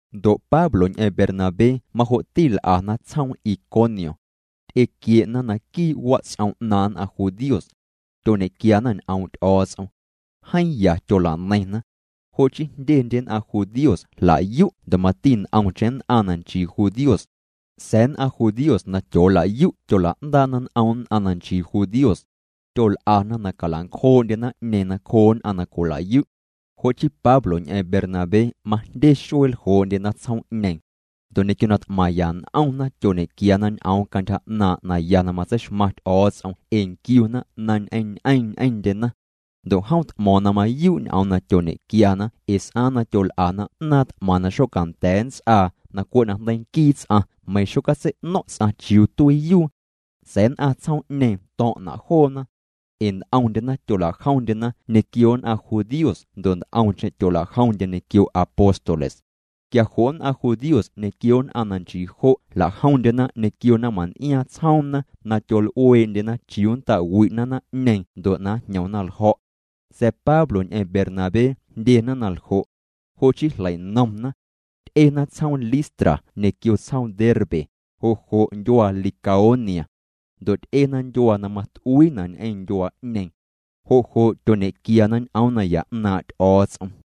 Ndo' Pablo ñ'eⁿ Bernabé majo'ti l'ana tsjoom Iconio. Ty'equie'na naquii' wats'om 'naaⁿ nn'aⁿ judíos. Tyoñequiana ñ'oom' Ty'o̱o̱ts'om. Jeeⁿ ya tyola'neiⁿna. Jo' chii jndyendye nn'aⁿ judíos jlayu' ndo' mati nt'omcheⁿ nn'aⁿ na nchii judíos. Sa̱a̱ nn'aⁿ judíos na tyoolayu' tyola'ndaa'na n'om nn'aⁿ na nchii judíos. Tyol'ana na calancjoo'ndye naⁿ'ñeeⁿ nacjoo nn'aⁿ na cwilayu'. Jo' chii Pablo ñ'eⁿ Bernabé majndye xuee ljoo'ndyena tsjoom'ñeeⁿ. Ndo' ñequio na t'maⁿya n'omna tyoñequiana ñ'oom cantyja 'naaⁿ' naya na matseixmaⁿ Ty'o̱o̱ts'om ee nquiuna na ñ'eⁿñ'eeⁿ ñ'eⁿndyena. Ndo' jom t'mo̱o̱ⁿ na mayuu' ñ'oom na tyoñequiana ee s'aaⁿ na tyol'ana 'naaⁿ t'maⁿ na xocanda̱a̱ nnts'aa na cwe' najndeii nquii ts'aⁿ meiⁿ xocatsei'no̱ⁿ' ts'aⁿ chiuu tuiiyuu. Sa̱a̱ nn'aⁿ tsjoom'ñeeⁿ to̱ⁿ'na' joona. Ee nt'omndyena tyola'jomndyena ñequio nn'aⁿ judíos ndo' nt'omcheⁿ tyola'jomndye ñequio apóstoles. Quia jo' nn'aⁿ judíos ñequio nn'aⁿ na nchii jo' jla'jomndyena ñequio naⁿmaⁿn'iaaⁿ tsjoomna na tyol'ueendyena chiuu nnta'wi'na naⁿ'ñeeⁿ ndo' na njñomna ljo̱'. Sa̱a̱ Pablo ñ'eⁿ Bernabé jndyena na ljo'. Jo' chii jleinomna. Ty'ena tsjoom Listra ñequio tsjoom Derbe, jo' jo' ndyuaa Licaonia. Ndo' ty'ena ndyuaa na mat'uiina' ñ'eⁿ ndyuaa'ñeeⁿ. Jo' jo' tyoñequiana ñ'oom naya 'naaⁿ' Ty'o̱o̱ts'om.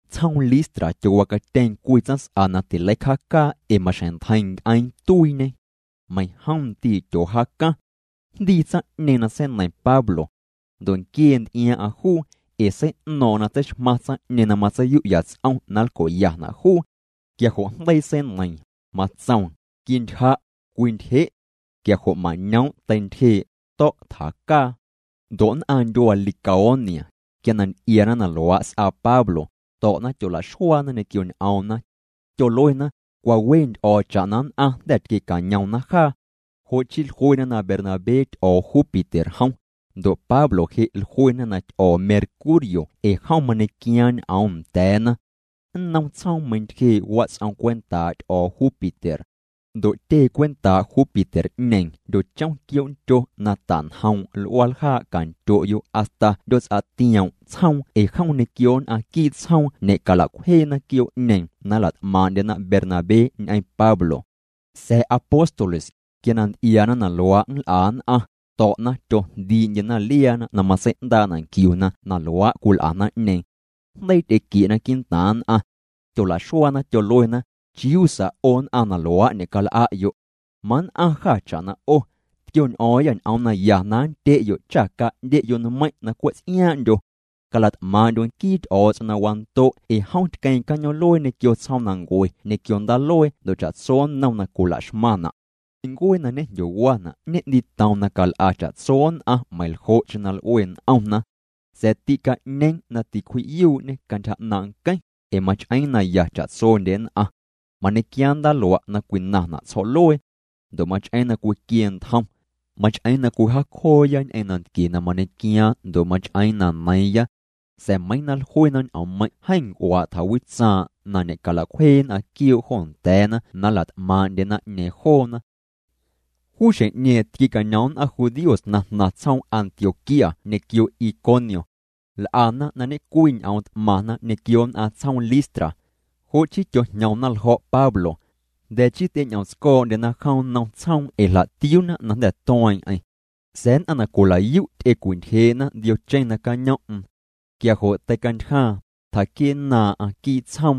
Tsjoom Listra tyowacatyeeⁿ cwii tsaⁿs'a na tileicjaacaa ee maxjeⁿ ntjeiⁿ nc'eeⁿ tuiiñê. Meiⁿjom ndii' tyoojaacaⁿ. Jndii tsaⁿ'ñeeⁿ na seineiⁿ Pablo. Ndo' nquiee nty'iaaⁿ'aⁿ juu, ee sei'no̱o̱ⁿ'o̱ⁿ na tseixmaⁿ tsaⁿ'ñeeⁿ na matseiyu'ya ts'om na nlco'yana' juu. Quia jo' jndeii seineiiⁿ, matsoom: —Quintyja', cwintyje'. Quia jo' mañoom' teintyjee', to̱' tjacaa. Ndo' nn'aⁿ ndyuaa Licaonia, quia na nty'iaana na luaa' s'aa Pablo, to̱'na tyola'xuaana ñequio ñ'oomna. Tyoluena: —Cwa we nty'o̱o̱ cha'na nn'aⁿ jnda̱ tquiecañomna jaa. Jo' chii jluena na Bernabé ty'o̱o̱ Júpiter jom, ndo' Pablo je' jluena na jom ty'o̱o̱ Mercurio ee jom mañequiaaⁿ ñ'oom nda̱a̱na. Nnom tsjoom meintyjee' wats'om cwentaa' ty'o̱o̱ Júpiter. Ndo' tyee cwentaa' Júpiter'ñeeⁿ jndyochom quioo'ndyo na ta'njoom' l'uaaljaa' cantyo'yo' hasta 'ndyoots'atioom' tsjoom ee jom ñequio nn'aⁿ quii' tsjoom ñe'cala'cwjeena quioo'ñeeⁿ na nla't'maaⁿ'ndyena Bernabé ñ'eⁿ Pablo. Sa̱a̱ apóstoles, quia na nty'iaana na luaa' nl'a nn'aⁿ, to̱'na tyojndii'ndyena liaana na matsei'ndaa'na' nquiuna na luaa' cwil'a naⁿ'ñeeⁿ. Jndeii ty'equie'na quii'ntaaⁿ nn'aⁿ. Tyolaxuaana tyoluena: —Chiuu sa 'o nn'aⁿ na luaa' ñe'cal'a'yo'. Mann'aⁿ jâ cha'na 'o. Tquioñ'o̱o̱ⁿyâ ñ'oom naya na nndye'yo' cha ca'ndye'yo' nmeiⁿ' na cwe' ts'iaaⁿ'ndyo. Calat'maaⁿ'ndyo' nquii Ty'o̱o̱ts'om na wando' ee jom tqueeⁿ cañoom'luee ñequio tsjoomnancue ñequio ndaaluee ndo' cha'tso nnom na cwilaxmaⁿna'. Ncuee na ñejndyowaana' ñe'ndiitoom na cal'a cha'tso nn'aⁿ meiⁿljo'cheⁿ na l'ue n'omna. Sa̱a̱ tîca'ñeeⁿ na ticwji'yuu'ñê cantyja 'naaⁿ' nqueⁿ, ee mach'eeⁿ naya cha'tsondye nn'aⁿ. Mañequiaaⁿ ndaaluaa' na cwinaⁿna' tsjo̱'luee. Ndo' mach'eeⁿ na cwiquie ntjom. Mach'eeⁿ na cwijaacjooya ñ'eⁿ nantquie na mañequiaaⁿ ndo' mach'eena' na neiiⁿya. Sa̱a̱ meiiⁿ na jluena ñ'oommeiⁿ' jeeⁿ nc'uaa' tjawitsaaⁿ' na ñe'calacwjee nn'aⁿ quioo' jo nda̱a̱na na nlat'maaⁿ'ndye naⁿ'ñeeⁿ joona. Juu xjeⁿ'ñeeⁿ tquiecañom nn'aⁿ judíos na jnaⁿ tsjoom Antioquía ñequio Iconio. L'ana na ñe'cwii ñ'oom t'maⁿna ñequio nn'aⁿ tsjoom Listra. Jo' chii tyojñomna ljo̱' Pablo. Jnda̱ chii ty'eñ'omtsco̱o̱'ndyena jom nnom tsjoom ee jla'tiuuna na jnda̱ tueeⁿ'eⁿ. Sa̱a̱ nn'aⁿ na cwilayu' ty'ecwintyjee'na ndiocheⁿ nacañom'm. Quia jo' teicantyjaaⁿ, tjaquie'nnaaⁿ'aⁿ quii' tsjoom.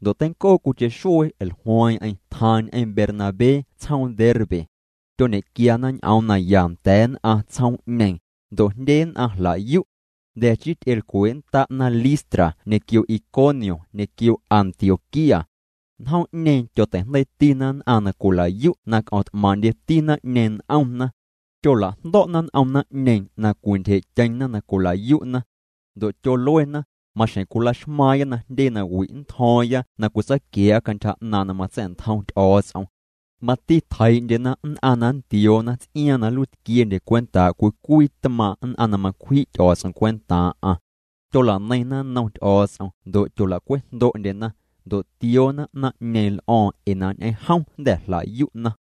Ndo' teincoo cwiicheⁿ xuee jlueeⁿ'eⁿ tjaaⁿ ñ'eⁿ Bernabé tsjoom Derbe. Tyoñequiana ñ'oom naya nda̱a̱ nn'aⁿ tsjoom'ñeeⁿ, ndo' jndye nn'aⁿ jlayu'. Jnda̱ chii ty'elcwee'nnda'na Listra ñequio Iconio ñequio Antioquía. Njoom'ñeeⁿ tyoteijndeiitina nn'aⁿ na cwilayu' na c'omt'maaⁿ'ndyeti naⁿ'ñeeⁿ n'omna. Tyola'jndo̱'na n'om naⁿ'ñeeⁿ na cwintyjee'tyeⁿna na cwilayu'na. Ndo' tyoluena: —Maxjeⁿ cwilaxmaaⁿya na jndye nawi' nntjo̱o̱ⁿya na cwitsaaquia̱a̱'a cantyja 'naaⁿ' na matsa̱'ntjom Ty'o̱o̱ts'om. Mati tjeii'ndyena nn'aⁿ na nntioona ts'iaaⁿ na nluiitquiendye cwentaa' cwii cwii tmaaⁿ' nn'aⁿ na macwji' Ty'o̱o̱ts'om cwentaaⁿ'aⁿ. Tyola'neiⁿna nnoom Ty'o̱o̱ts'om ndo' tyola'cwejndo'ndyena. Ndo' tioona naⁿ'ñeeⁿ l'o̱o̱ⁿ ee na ñ'eⁿ jom jnda̱ jlayu'na.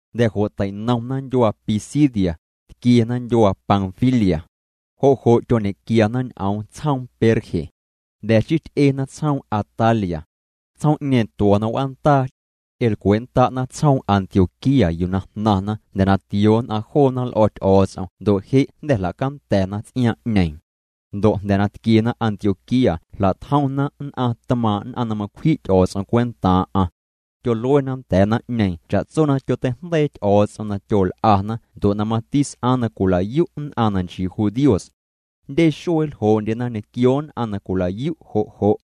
Jnda̱ jo' tei'nomna ndyuaa Pisidia, tquiena ndyuaa Panfilia. Jo' jo' tyoñequiana ñ'oom tsjoom Perge. Jnda̱ chii ty'ena tsjoom Atalia. Tsjoom'ñeeⁿ tuo̱na w'aandaa. Ty'elcwee'nnda'na tsjoom Antioquía yuu na jnaⁿna jnda̱ na tioo nn'aⁿ joona l'o̱ Ty'o̱o̱ts'om ndo' je' jnda̱ jlacanda̱na ts'iaaⁿ'ñeeⁿ. Ndo' jnda̱ na tquiena Antioquía jla'tjomna nn'aⁿ tmaaⁿ' nn'aⁿ na macwji' Ty'o̱o̱ts'om cwentaaⁿ'aⁿ. Tyoluena nda̱a̱ naⁿ'ñeeⁿ cha'tso na tyoteijndeii Ty'o̱o̱ts'om na tyol'ana ndo' na mati s'aaⁿ na cwilayu' nn'aⁿ na nchii judíos. Jndye xuee ljoo'ndyena ñequio nn'aⁿ na cwilayu' jo' jo'.